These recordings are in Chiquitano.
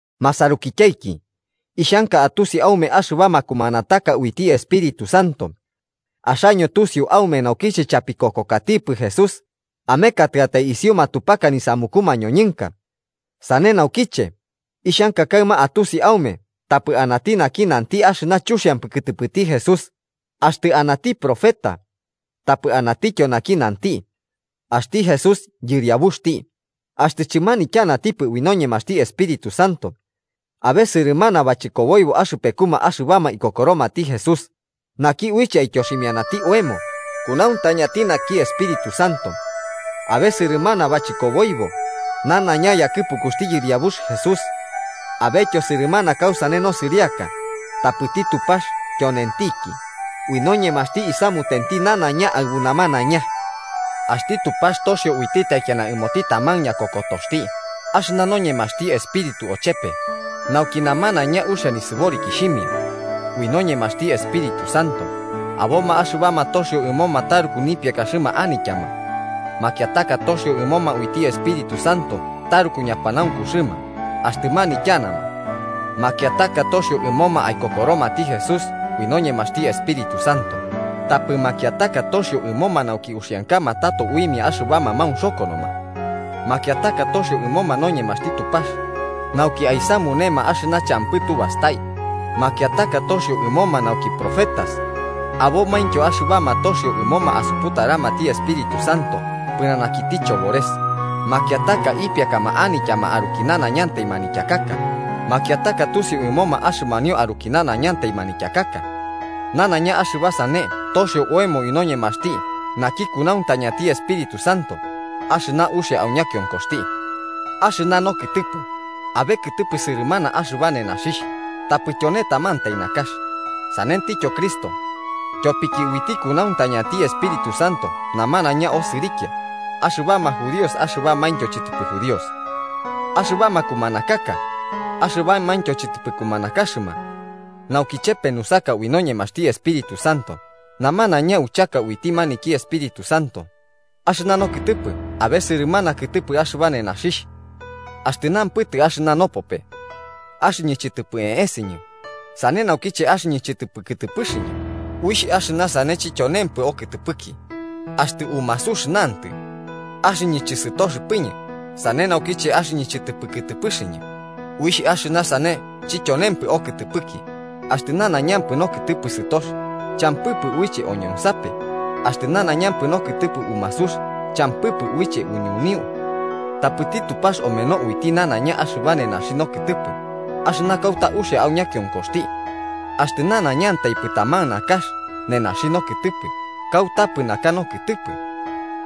Masarukityaiki, ixhanka atusi aume axɨba makumanataka uiti Espíritu Santo. Axaño tusiu aume naukiche chapikokokatikipɨ Jesús amekatɨatai isiu matupaka nisamuku mañoñɨnka. Sane naukiche, ixhanka kaɨma atusi aume tapɨ anati naki nanti axɨna chuxiampɨ kɨtɨpɨti Jesús, axtɨ anati profeta. Tapɨ anatityo naki nanti: “¡Axti Jesús Yɨriabuxti!”, axtɨ chɨmanityanatipɨ ui noñemaxti Espíritu Santo. Abe sɨrɨmana bachɨkoboibo axɨpekuma axɨbama ikokoromati Jesús, naki uiche aityoximiati oemo kunauntañati naki Espíritu Santo. Abe sɨrɨmana bachɨkoboibo, nanaiña yakɨpukuxti Yɨriabux Jesús. Abetyo sɨrɨmana kausane nosɨriaka, tapɨti Tupax tyonentiki, ui noñemaxti isamutenti nanaiña aɨbu namanaiña. Axti Tupax toxio uiti taikiana ɨmoti taman ñakokotoxti axɨna noñemaxti Espíritu ochepe, nauki namanaiña uxia nisɨborikixhimia. Ui noñemaxti Espíritu Santo, aboma axɨbama toxio ɨmoma taruku nipiakaxɨma anityama. Makiataka toxio ɨmoma uiti Espíritu Santo taruku ñapanaunkuxɨma axtɨ manityanama. Makiataka toxio ɨmoma aikokoromati Jesús ui noñemaxti Espíritu Santo, tapɨ makiataka toxio ɨmoma nauki uxiankama tato uimia axɨbama maunxokonoma. Makiataka toxio ɨmoma noñemaxti Tupax nauki aisamunema axɨna champɨ tubastai, makiataka toxio ɨmoma nauki profetas Abomaintyo axɨbama toxio ɨmoma asuputaramati Espíritu Santo pɨnanakiti chobores, makiataka ipiakama anityama aruki nanaiña manityakaka, makiataka tusiu ɨmoma axɨmanio aruki nanaiñantai manityakaka. Nanaiña axɨba sane toxio oemo ui noñemaxti naki kunauntañati Espíritu Santo, axɨna uxia au ñakionkoxti. Axɨna nokɨtɨpɨ, abe kɨtɨpɨ sɨrɨmana axɨba nenaxixh, tapɨ tyone tamantai nakax. Sanentityo Cristo. Tyopiki uiti kunauntañanti Espíritu Santo namanaiña osɨrikia, axɨbama judíos axɨbamaintyo chɨtɨpɨ judíos, axɨbama kumanakaka axɨbamaintyo chɨtɨpɨ kumanakaxɨma nauki chepe nusaka ui noñemaxti Espíritu Santo. Namanaiña uchaka uiti maniki Espíritu Santo. Axɨna nokɨtɨpɨ abe sɨrɨmana kɨtɨpɨ axɨba nenaxixh. Axtɨ nampɨtɨ axɨna nopope: “Axɨñɨ chɨtɨpɨ eeseñɨ sane naukiche axɨñɨ chɨtɨpɨ kɨtɨpɨxɨñɨ”, uixh axɨna sane chityonempɨ okɨtɨpɨki. Axtɨ umasux nantɨ: “Axɨñɨ chɨsɨtoxɨpɨñɨ, sane naukiche axɨñɨ chɨtɨpɨ kɨtɨpɨxɨñɨ”, uixh axɨna sane chityonempɨ okɨtɨpɨki. Axtɨ nanaiñampɨ nokɨtɨpɨ sɨtox, champɨpɨ uiche oñonsape. Axtɨ nanaiñampɨ nokɨtɨpɨ umasux, champɨpɨ uiche uñuniu. Tapɨti Tupax omeno uiti nanaiña axɨba nenaxi nokɨtɨpɨ axɨna kauta uxia au ñakionkoxti. Axtɨ nanaiñantaipɨ taman nakax nenaxi nokɨtɨpɨ, kautapɨ naka nokɨtɨpɨ.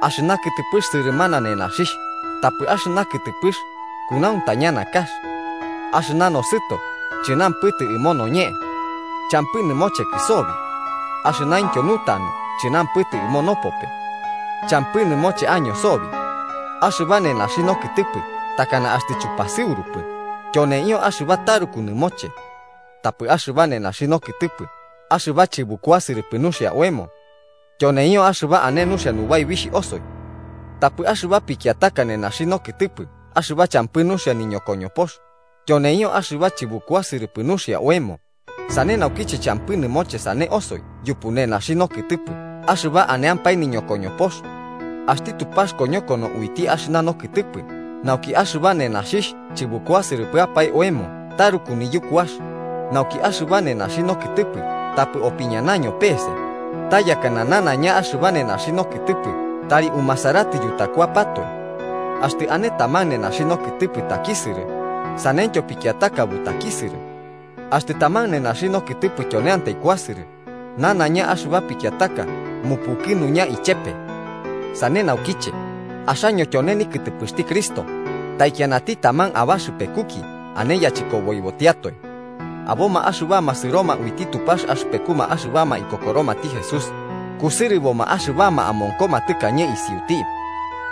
Axɨna kɨtɨpɨx sɨrɨmana nenaxixh, tapɨ axɨna kɨtɨpɨx kunauntaña nakax. Axɨna nosɨto chɨnampɨtɨ ɨmo noñe: “Champɨ nɨmochekɨ sobi.” Axɨnaintyo nutanu chɨnampɨtɨ ɨmo nopope: “Champɨ nɨmoche año sobi.” Axɨba nenaxi nokɨtɨpɨ takana axtɨ chupasɨurupɨ, tyoneio axɨba taruku nɨmoche. Tapɨ axɨba nenaxi nokɨtɨpɨ axɨba chɨbukuasɨrɨpɨ nuxia oemo, tyoneio axɨba ane nuxia nubaibixh osoi. Tapɨ axɨba pikiataka nenaxi nokɨtɨpɨ axɨba champɨ nuxia niñokoñopox, tyoneio axɨba chɨbukuasɨrɨpɨ nuxia oemo, sane naukiche champɨ nɨmoche sane osoi yupu nenaxi nokɨtɨpɨ axɨba aneampae niñokoñopox. Axti Tupax koñokono uiti axɨna nokɨtɨpɨ nauki axɨba nenaxixh chɨbukuasɨrɨpɨapae oemo taruku niyukuax, nauki axɨba nenaxi nokɨtɨpɨ tapɨ opiñanaño pese, ta yakɨna nanaiña axɨba nenaxi nokɨtɨpɨ tari umasaratɨ yutakuapatoe. Axtɨ ane taman nenaxi nokɨtɨpɨ takisɨrɨ, saneityo pikiataka butakisɨrɨ. Axtɨ taman nenaxi nokɨtɨpɨ tyoneantai kuasɨrɨ, nanaiña axɨba pikiataka mupukɨnuña ichepe. Sane naukiche, axaño tyone nikɨtɨpɨxti Cristo, taikianati taman abaxɨpekuki ane yachɨkoboibotiatoe. Aboma axɨbama sɨroma uiti Tupax axɨpekuma axɨbama ikokoromati Jesús, kusɨrɨboma axɨbama amonkoma tɨkañe isiuti.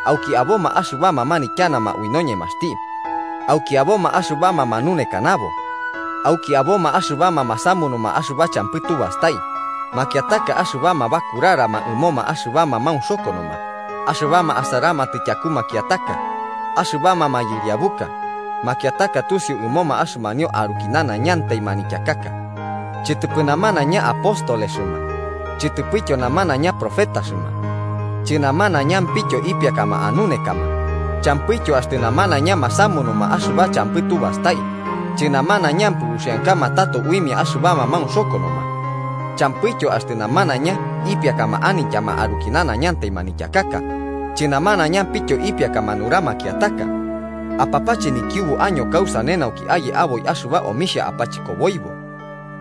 Auki aboma axɨbama manityanama ui noñemaxti. Auki aboma axɨbama manunekanabo. Auki aboma axɨbama masamunuma axɨba champɨ tu bastai, makiataka axɨbama bakurarama ɨmoma axɨbama maunxokonoma, axɨbama asaramatɨ tyaku makiataka, axɨbama mayɨriabuka, makiataka tusiu ɨmoma axɨmanio aruki nanaiñantai manityakaka. Chɨtɨpɨ namanaiña apóstolexɨma, chɨtɨpɨtyo namanaiña profetaxɨma. Chɨnamanaiñampityo ipiakama anunekama, champɨityo axtɨ namanaiña masamunuma axɨba champɨ tubastai, chɨnamanaiñampɨ uxiankama tato uimia axɨbama maunxokonoma. Champɨityo axtɨ namanaiña ipiakama anityama aruki nanaiñantai manityakaka, chɨnamanaiñampityo ipiakama nura makiataka. Apapache nikiubu año kausane nauki aye aboi axɨba omixhia apachɨkoboibo.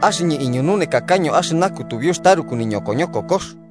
Axɨñɨ iñununekakaño axɨna kutubiux taruku nikoñokokox